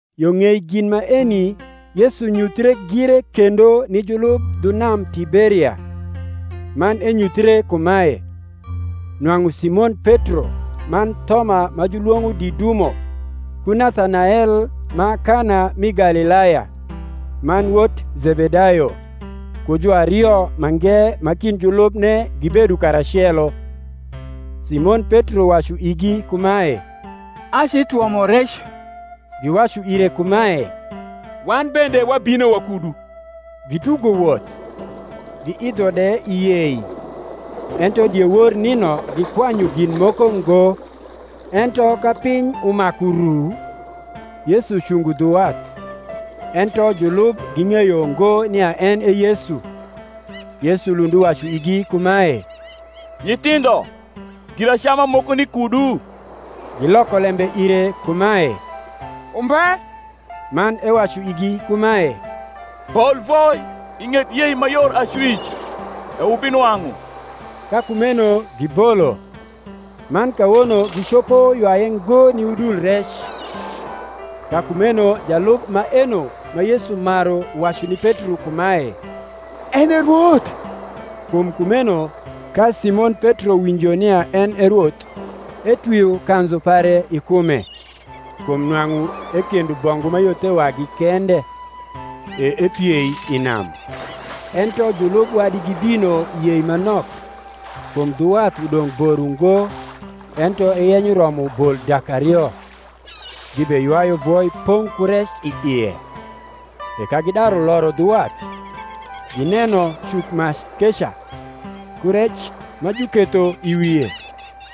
Yo ng’ei gin maeni Yesu nyuthie gire kendo ni julub dhu nam Tiberia; man enyuthre kumae, Nwang’u Simon Petro man Thoma ma julwong’o Didumo, ku Nathanael ma Kana mi Galilaya, man wot Zebedayo, ku juario mange ma kind julubne gibedo karacelo. Simon Petro wacu igi kumae, Acitwomo rec. Giwacu ire kumae, Wan bende wabino wakudu. Gitugo woth, giidho de i yei; ento diewor nino gikwanyu gin moko ngo. Ento ka piny umaku ru, Yesu cungo dhu wath: ento julub ging’eyo ngo nia en e Yesu. Yesu lund uwacu igi kumae, Nyithindho, giracama moko ni kudu? Giloko lembe ire kumae, Umbe. Man ewacu igi kumae, Bol voi i ng’et yei ma yor acwic, e wubinwang’u. Ka kumeno gibolo, man kawono gicopo ywaye ngo ni udul rec. Ka kumeno jalub maeno ma Yesu maru wacu ni Petro kumae, En e Rwoth. Kum kumeno ka Simon Petro winjo nia en e Rwoth, etwio kanzu pare i kume (kum nwang’u ekendo bongu ma yo the wagi kende), e epiei i nam. Ento julub wadi gibino i yei ma nok (kum dhu wath udong’ bor uugo, ento eyenyo romo bol dak ario), gibeywayu voi pong’ ku rec i ie. E ka gidaru loro dhu wath, gineno cukmac keca, ku rec ma juketho i wie,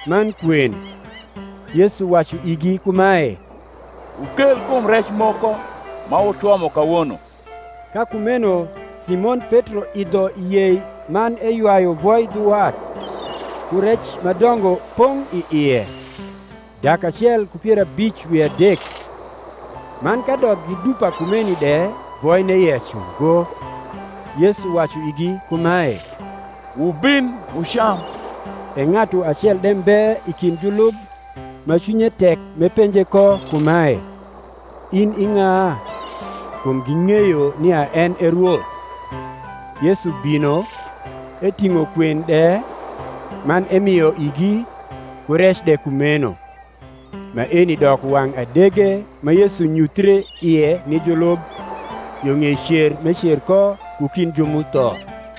man kwen. Yesu wacu igi kumae, Wukel kum rec moko ma wutwomo kawono. Ka kumeno Simon Petro idho i yei man eywayu voi dhu wath, ku rec ma dongo pong’ i ie, dak acel ku pier abic wi adek: man kadok gi dupa kumeni de voine yec ungo. Yesu wacu igi kumae, Wubin wucam. E ng’atu acel de mbe i kind julub ma cwinye tek m’epenje ko kumae, In i ng’a? kum ging’eyo nia en e Rwoth. Yesu bino, eting’o kwen de, man emio igi, ku rec de kumeno. Maeni doko wang’ adege ma Yesu nyuthie ie ni julub, yo ng’ei cer m’ecer ko ku kind ju m’utho.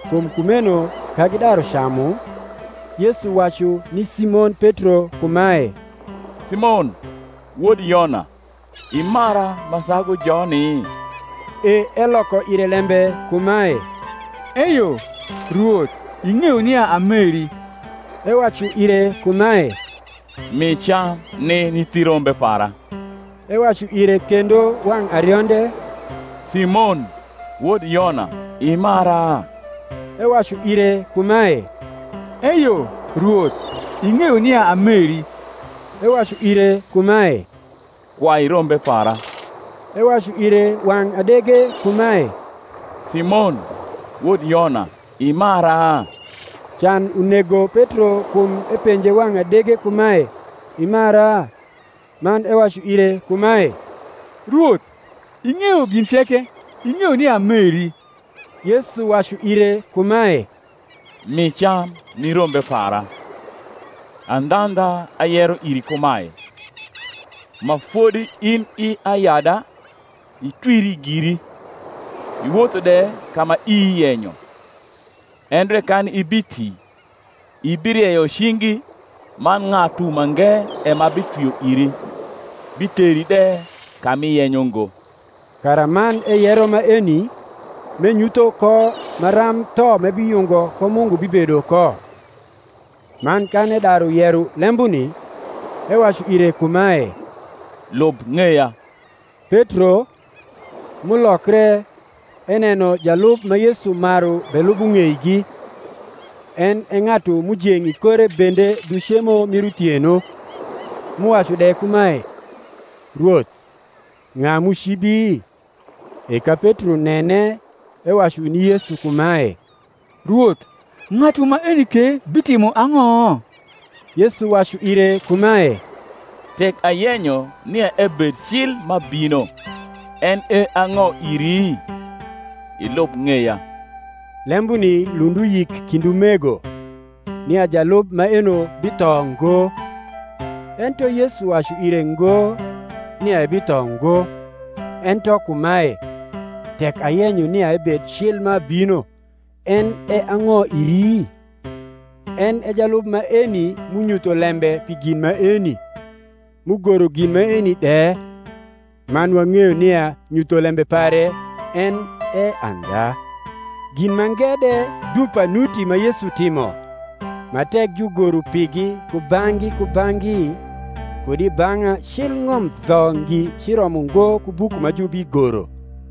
Kum kumeno ka gidaru camu, Yesu wacu ni Simon Petro kumae, Simon, wod Yona, imara ma sagu joni? E eloko ire lembe kumae, Eyo, Rwoth; ing’eyo nia ameri. Ewacu ire kumae, Mi cam ni nyithi rombe para. Ewacu ire kendo wang’ arionde, Simon, wod Yona, imara? Ewacu ire kumae, Eyo, Rwoth; ing’eyo nia ameri. Ewacu ire kumae, Kwai rombe para. Ewacu ire wang’ adege kumae Simon, wod Yona, imara? Can unego Petro kum epenje wang’ adege kumae, Imara? Man ewacu ire kumae, Rwoth, ing’eyo gin ceke; ing’eyo nia ameri. Yesu wacu ire kumae, Mi cam ni rombe para. Andhandha, ayero iri kumae, Ma fodi in i ayada, itwiri giri, iwotho de ka ma ii yenyo: endre kan ibiti, ibirieyo cingi, man ng’atu mange e ma bitwio iri, biteri de ka m’iyenyo ngo. Karaman eyero maeni, m’enyutho ko maram tho m’ebiyungo ko Mungu bibedo ko. Man kan edaru yero lembuni, ewacu ire kumae, Lub ng’eya. Petro, m’ulokre, eneno jalub ma Yesu maru belubo ng’eigi; en e ng’atu m’ujeng’ i kore bende dhu cemo mii uthieno, m’uwacu de kumae, Rwoth, ng’a m’ucibi? E ka Petro nene ewacu ni Yesu kumae, Rwoth, ng’atu maeni ke bitimo ang’o? Yesu wacu ire kumae, Tek ayenyo nia ebed cil m’abino, en e ang’o iri? ilub ng’eya. Lembuni lund uyik kind umego, nia jalub maeno bitho ngo: ento Yesu wacu ire ngo, nia ebitho ngo; ento kumae, Tek ayenyo nia ebed cil m’abino, en e ang’o iri? En e jalub maeni m’unyutho lembe pi gin maeni, m’ugoro gin maeni de: man wang’eyo nia nyutholembe pare en e andha. Gin mange de dupa nuti ma Yesu timo, ma tek jugoro pigi kubang’gi kubang’gi, kud i bang’a cil ng’om dho ngi ciromo ngo ku buku ma jubigoro.